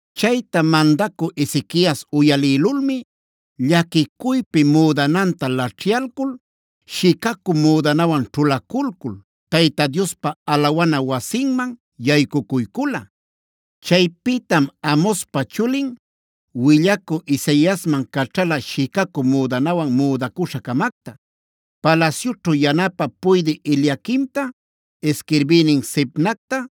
Chayta mandacü Ezequias uyalïlulmi llaquicuypi müdananta laćhyalcul, shicacü müdanawan ćhulaculcul Tayta Diospa alawana wasinman yaycucuycula. Chaypïtam Amozpa chulin willacü Isaiasman caćhala shicacü müdanawan müdacuśha-camacta, palasyućhu yanapä puydï Eliaquimta, isquirbïnin Sebnacta,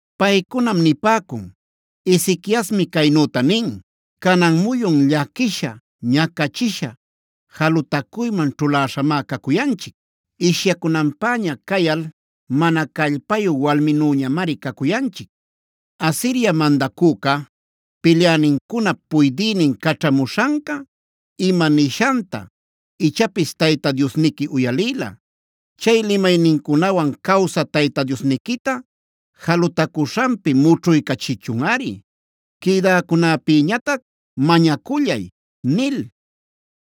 Paycunam nipäcun: “Ezequiasmi caynüta nin: ‘Canan muyun llaquisha, ñacachisha, jalutacuyman ćhuläśhamá cacuyanchic; ishyacunanpäña cayal mana callpayu walminüñamari cacuyanchic. Asiria mandacüca pilyänincunap puydïnin caćhamuśhanca ima nishanta, ichapis Tayta Diosniqui uyalïla. Chay limaynincunawan cawsä Tayta Diosniquita jalutacuśhanpi mućhuycachichunꞌari. Quïdäcunäpïñatac mañacullay’” nil.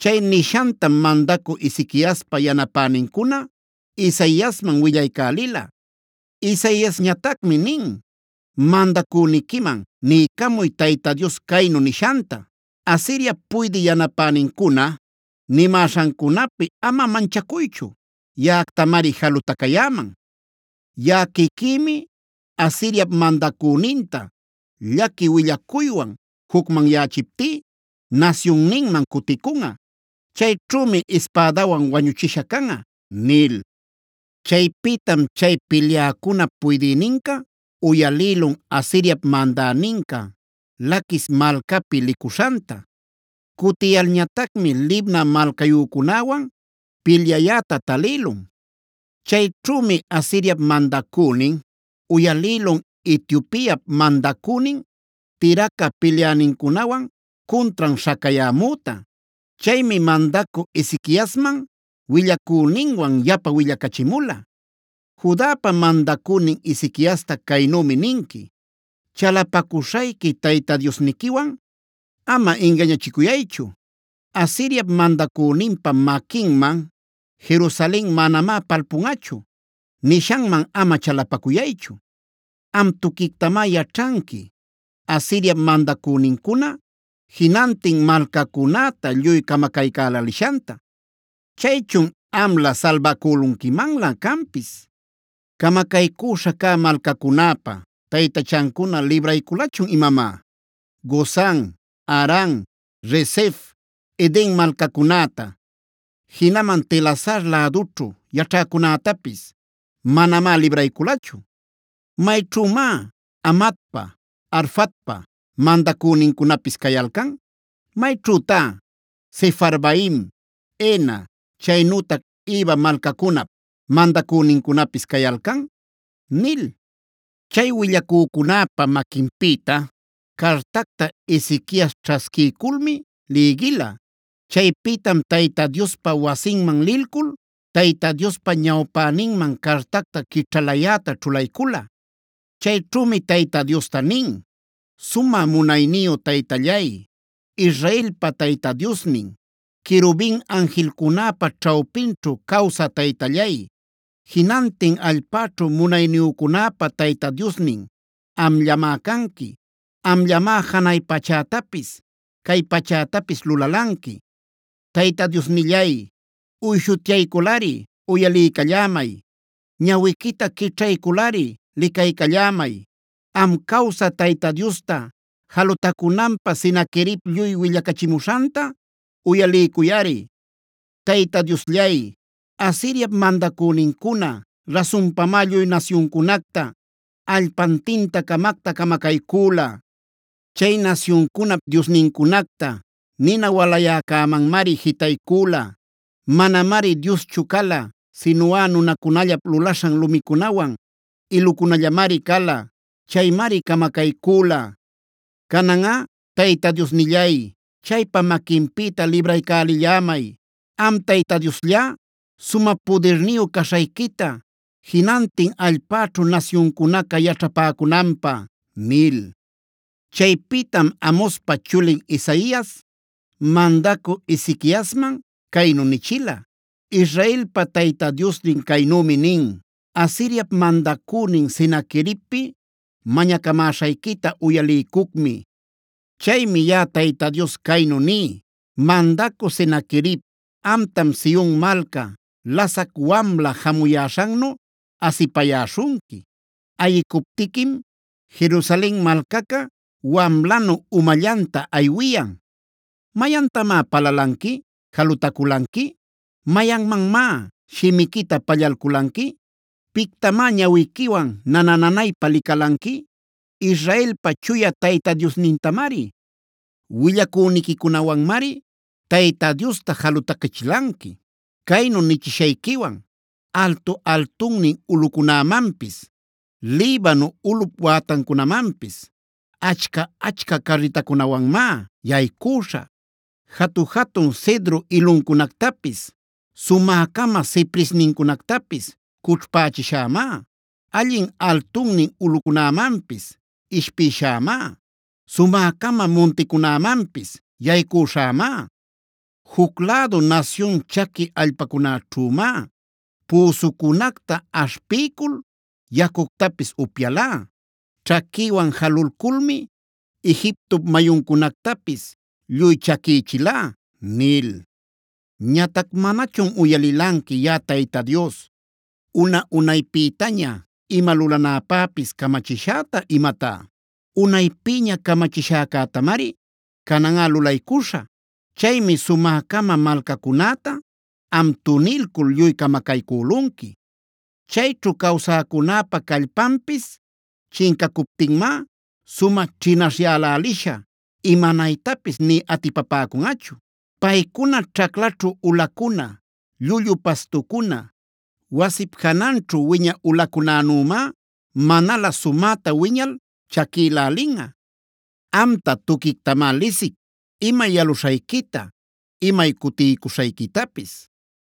Chay nishantam mandacü Ezequiaspa yanapänincuna, Isaiasman willaycälila. Isaiasñatacmi nin: “Mandacüniquiman niycamuy Tayta Dios caynu nishanta: ‘Asiriap puydï yanapänincuna nimäśhancunapi ama manchacuychu; yaꞌactamari jalutacayäman. Yaꞌa quiquïmi Asiriap mandacüninta llaqui willacuywan jucmanyächiptí nasyunninman cuticunꞌa. Chayćhümi ispädawan wañuchisha canꞌa’” nil. Chaypïtam chay pilyäcunap puydïninca uyalïlun Asiriap mandäninca Laquis malcapi licuśhanta. Cutiyalñatacmi Libna malcayücunäwan pilyayäta talïlun. Chayćhümi Asiriap mandacünin uyalïlun Etiopiap mandacünin Tirhaca pilyänincunawan cuntran śhacayämüta. Chaymi mandacü Ezequiasman willacüninwan yapa willacachimula: “Judapa mandacünin Ezequiasta caynümi ninqui: Chalapacuśhayqui Tayta Diosniquiwan ama ingañachicuyaychu. Asiriap mandacüninpa maquinman Jerusalen manamá palpunꞌachu, nishanman ama chalapacuyaychu. Am tuquictamá yaćhanqui Asiriap mandacünincuna jinantin malcacunäta lluy camacaycälälishanta. Chaychun ¿amlä salbacülunquimanlä canpis? ¿Camacaycüśha cä malcacunäpa taytachancuna librayculachun imamá? Gozan, Haran, Resef, Eden malcacunäta, jinaman Telasar lädućhu yaćhäcunätapis manamá librayculachu. ¿Mayćhümá Hamatpa, Arfadpa mandacünincunapis cayalcan? ¿Mayćhütá Sefarvaim, Hena, chaynütac Iva malcacunap mandacünincunapis cayalcan?”b nil. Chay willacücunäpa maquinpïta cartacta Ezequias ćhasquiyculmi lïgila. Chaypïtam Tayta Diospa wasinman lilcul, Tayta Diospa ñawpäninman cartacta quićhalayäta ćhulaycula. Chayćhümi Tayta Diosta nin: “Sumä munayniyu Taytallay, Israelpa Tayta Diosnin, querubinc anjilcunäpa ćhawpinćhu cawsä Taytallay, jinantin allpäćhu munayniyücunäpa Tayta Diosnin amllamá canqui. Amllamá janay pachätapis cay pachätapis lulalanqui. Tayta Diosnillay, uyshutyayculꞌari uyaliycallämay; ñawiquita quićhayculꞌari licaycallämay. Am cawsä Tayta Diosta jalutacunanpä Senaquerib lluy willacachimuśhanta uyaliycuyꞌari. Tayta Diosllay, Asiriap mandacünincuna rasunpamá lluy nasyuncunacta allpantinta-camacta camacaycüla. Chay nasyuncunap diosnincunacta nina walayäcämanmari jitaycüla. Manamari dioschu cala, sinuꞌa nunacunallap lulaśhan lumicunawan ilucunallamari cala. Chaymari camacaycüla. Cananꞌa Tayta Diosnillay, chaypa maquinpïta libraycälillämay, am Tayta Diosllá sumä pudirniyu caśhayquita jinantin allpäćhu nasyuncunaca yaćhapäcunanpä” nil. Chaypïtam Amozpa chulin Isaias mandacü Ezequiasman caynu nichila: “Israelpa Tayta Diosnin caynümi nin: Asiriap mandacünin Senaqueribpi mañacamäśhayquita uyaliycucmi. “Chaymi yaꞌa Tayta Dios caynu ní: “ ‘Mandacü Senaquerib, amtam Sion malca lasac wamla jamuyäśhannu asipayäśhunqui. Ayicuptiquim, Jerusalen malcaca wamlanu umallanta aywiyan. ¿Mayantamá palalanqui, jalutaculanqui? ¿Mayanmanmá shimiquita pallalculanqui? ¿Pictamá ñawiquiwan nana-nanaypa licalanqui? ¡Israelpa Chuya Tayta Diosnintamari! Willacüniquicunawanmari Tayta Diosta jalutacachilanqui, caynu nichishayquiwan: “Altu-altunnin ulꞌucunämanpis, Libano ulꞌup wätancunamanpis, achca-achca carritäcunawanmá yaycüśhä. Jatu-jatun cedro iluncunactapis, sumä-cama cipresnincunactapis cućhpächishämá. Allin altunnin ulꞌucunämanpis ishpïshämá; sumä-cama munticunämanpis yaycüśhämá. Juc lädu nasyun chaqui allpacunäćhümá, püsucunacta aśhpiycul yacuctapis upyalá. Ćhaquïwan jalulculmi Egiptop mayuncunactapis lluy chaquïchilá” nil. “ ‘Ñatac ¿manachun uyalilanqui yaꞌa Tayta Dios, una-unaypïtaña ima lulanäpäpis camachishäta imatá? Unaypïña camachishäcätamari cananꞌa lulaycuśhä. Chaymi sumä-cama malcacunäta, am tunilcul lluy camacaycülunqui. Chayćhu cawsäcunäpa callpanpis chincacuptinmá, sumä ćhinaśhyäläliśha imanaytapis nï atipapäcunꞌachu. Paycuna ćhaclaćhu ulacuna, llullu pastucuna, wasip jananćhu wiñä ulacunänümá, manalä sumäta wiñal chaquilälinꞌa. “ ‘Amta tuquictamá lisic; imay yaluśhayquita, imay cutiycuśhayquitapis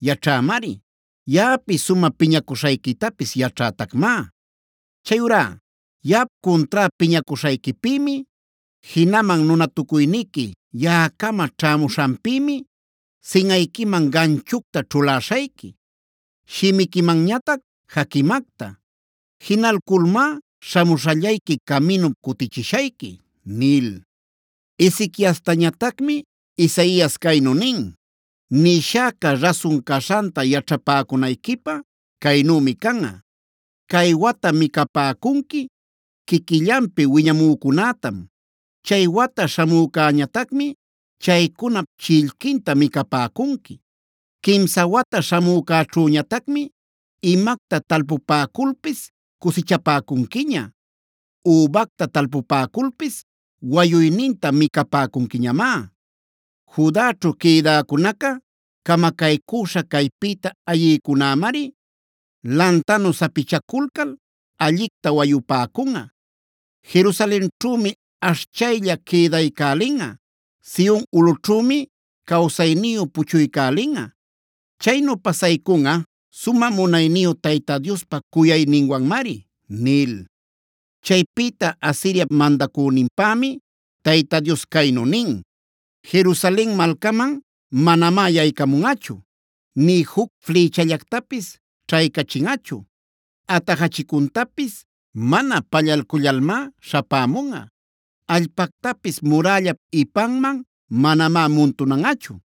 yaćhämari. Yaꞌapi sumä piñacuśhayquitapis yaćhätacmá. Chayurá yaꞌap cuntrá piñacuśhayquipïmi, jinaman nunatucuyniqui yaꞌacama ćhämuśhanpïmi, sinꞌayquiman ganchucta ćhuläśhayqui, shimiquimanñatac jaquimacta. Jinalculmá śhamuśhallayqui caminup cutichishayqui’” nil. Ezequiastañatacmi Isaias caynu nin: “Nishäca rasun caśhanta yaćhapäcunayquipä caynümi canꞌa. Cay wata micapäcunqui quiquillanpi wiñamücunätam; chay wata śhamücañatacmi chaycunap chillquinta micapäcunqui. Quimsa wata śhamücäćhüñatacmi imacta talpupäculpis cusichapäcunquiña; übacta talpupäculpis wayuyninta micapäcunquiñamá. Judaćhu quïdäcunaca, camacaycüśha caypïta ayïcunämari lantanu sapichaculcal allicta wayupäcunꞌa. Jerusalenćhümi ashchaylla quïdaycälinꞌa; Sion ulꞌućhümi cawsayniyu puchuycälinꞌa. Chaynu pasaycunꞌa sumä munayniyu Tayta Diospa cuyayninwanmari” nil. Chaypïta Asiriap mandacüninpämi Tayta Dios caynu nin: “Jerusalen malcaman manamá yaycamunꞌachu, nï juc flïchallactapis ćhaycachinꞌachu; atajachicuntapis mana pallalcullalmá śhapämunꞌa; allpactapis murällap ipanman manamá muntunanꞌachu.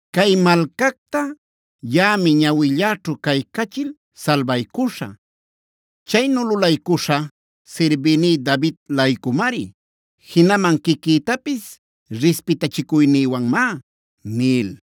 Cay malcacta yaꞌami ñawilläćhu caycachil salbaycuśhä. Chaynu lulaycuśhä sirbïní David-laycumari, jinaman quiquïtapis rispitachicuynïwanmá” nil.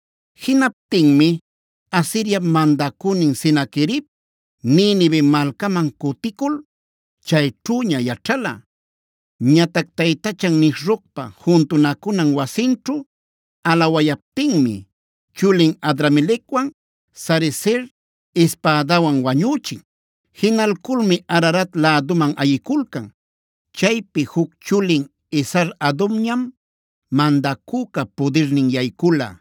Jinaptinmi Asiriap mandacünin Senaquerib, Ninive malcaman cuticul chayćhüña yaćhala. Ñatac taytachan Nisrocpa juntunacunan wasinćhu alawayaptinmi chulin Adramelecwan Sarezer ispädawan wañüchin. Jinalculmi Ararat läduman ayiculcan. Chaypi juc chulin Esar-hadonñam mandacüca pudirnin yaycula.